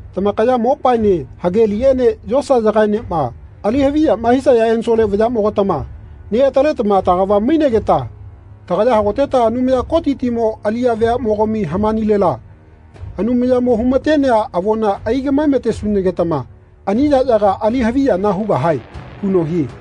“Tamakaya mopaene hageliꞌene yosayagaenema ali haviyama hisaya ensole vayaꞌmogatama neꞌataletama tagava mainegeta tagaya hagoteta Anumaya Kotitimo aliꞌya veaꞌmogami hamanilela Anumayamoꞌma humatenea avona aigaꞌmae-matetesunagetama ani yaꞌyaga ali haviyana hugahae” huno hie.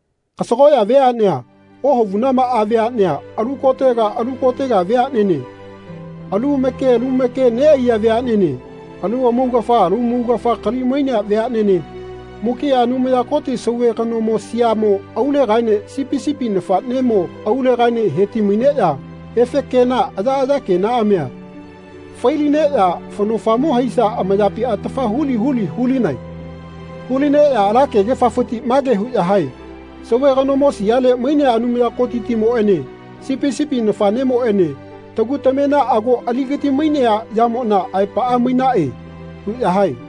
Kasagoꞌya veaꞌnea ohavunamaꞌa veaꞌnea alu kotega alu kotega veaꞌnene, alu make alu make neꞌaiya veaꞌnene, alu amaugafa lu amaugafa kali-mainea veaꞌnene, mukiꞌa Anumaya Koti sauve kanomo siamo aulegaene Sipi sipi nafaꞌnemo aulegaene heti-maineꞌya efe kena ayaꞌaya kenaꞌamia failineꞌya faꞌnofamo haisa amayapi atafa huli huli hulinae. Hu-lineꞌya ala kegefafiti mage huꞌya hae “Sauve kanomo siale mainea Anumaya Kotitimoꞌene Sipi sipi nafaꞌnemoꞌene tagu tamema ago aligati-mainea yamona aepaꞌa mainaꞌe.” huꞌya hae.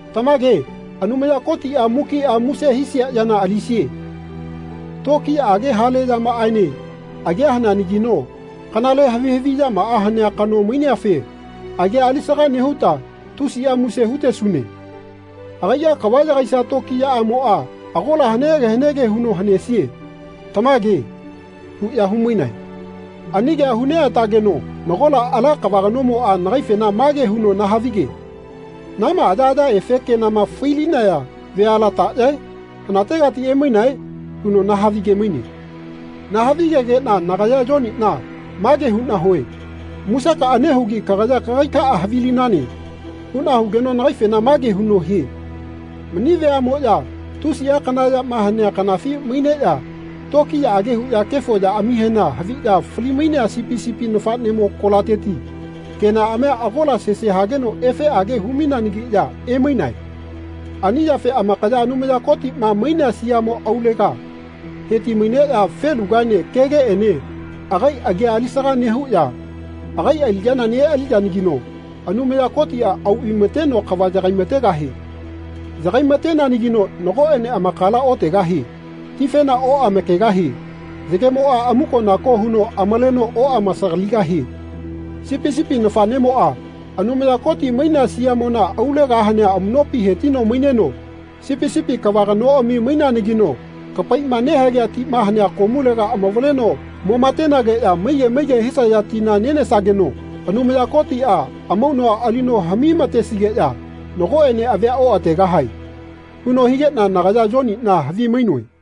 “Tamage Anumaya Kotiꞌa mukiꞌa muse hisia yana alisie. Tokiyaꞌage hale yamaꞌaene agia haneanagino kanale havi haviꞌyamaꞌa hanea kano maineafe agia alisaga nehuta tusiꞌa muse hutesune. Agaiꞌa kava yagaisia tokiyaꞌamoꞌa agola hanege hanege huno hanesie. Tamage.” huꞌya humainae. Ani kea hu neꞌatageno nagola ala kava kanomoꞌa nagaifena mage huno nahavige “Nama ayaꞌaya efe kenama fai-linaya veala taꞌyae? Hanategati emainae?” huno nahavige-maine. Nahavigegeꞌna nagaya, Yoniꞌna, mage huꞌna hue “Musekaꞌa nehugi kagaya kagaikaꞌa havilinane.” huꞌna hugeno nagaifena mage huno hie “Mani veaꞌmoꞌya tusiꞌa kana yama hanea kanafi maineꞌya tokiyaꞌage huꞌya kefo yaꞌamihema haviꞌya fali-mainea Sipi sipi nafaꞌnemo kolateti kenaꞌamia agola sese hageno efeꞌage hu-maineanagiꞌya emainae. Ani yafe amakaya Anumaya Kotiꞌma mainea siamo aulega heti-maineꞌya felugaene kegeꞌene agai agia alisaga nehuꞌya agai aliꞌya neꞌaliyanagino Anumaya Kotiꞌa au vaimateno kava yagaimategahie. Yagai-mateneanagino nagoꞌene amakala otegahie. Tifena oꞌamakegahie. Yagemoꞌa amuko-nako huno amaleno oꞌamasagaligahie. Sipi sipi nafaꞌnemoꞌa Anumaya Koti mainea siamona aulega hanea amuꞌnopi hetino maineno sipi sipi kava kanoꞌami maineanagino kapaiꞌma nehagea tima hanea komulega amavaleno mo matenageꞌya maige maige hisaya tina nenesageno Anumaya Kotiꞌa amaunua alino haꞌmi-matesigeꞌya nagoꞌene avia oꞌategahae.” huno higeꞌna nagaya Yoniꞌna havimainoe.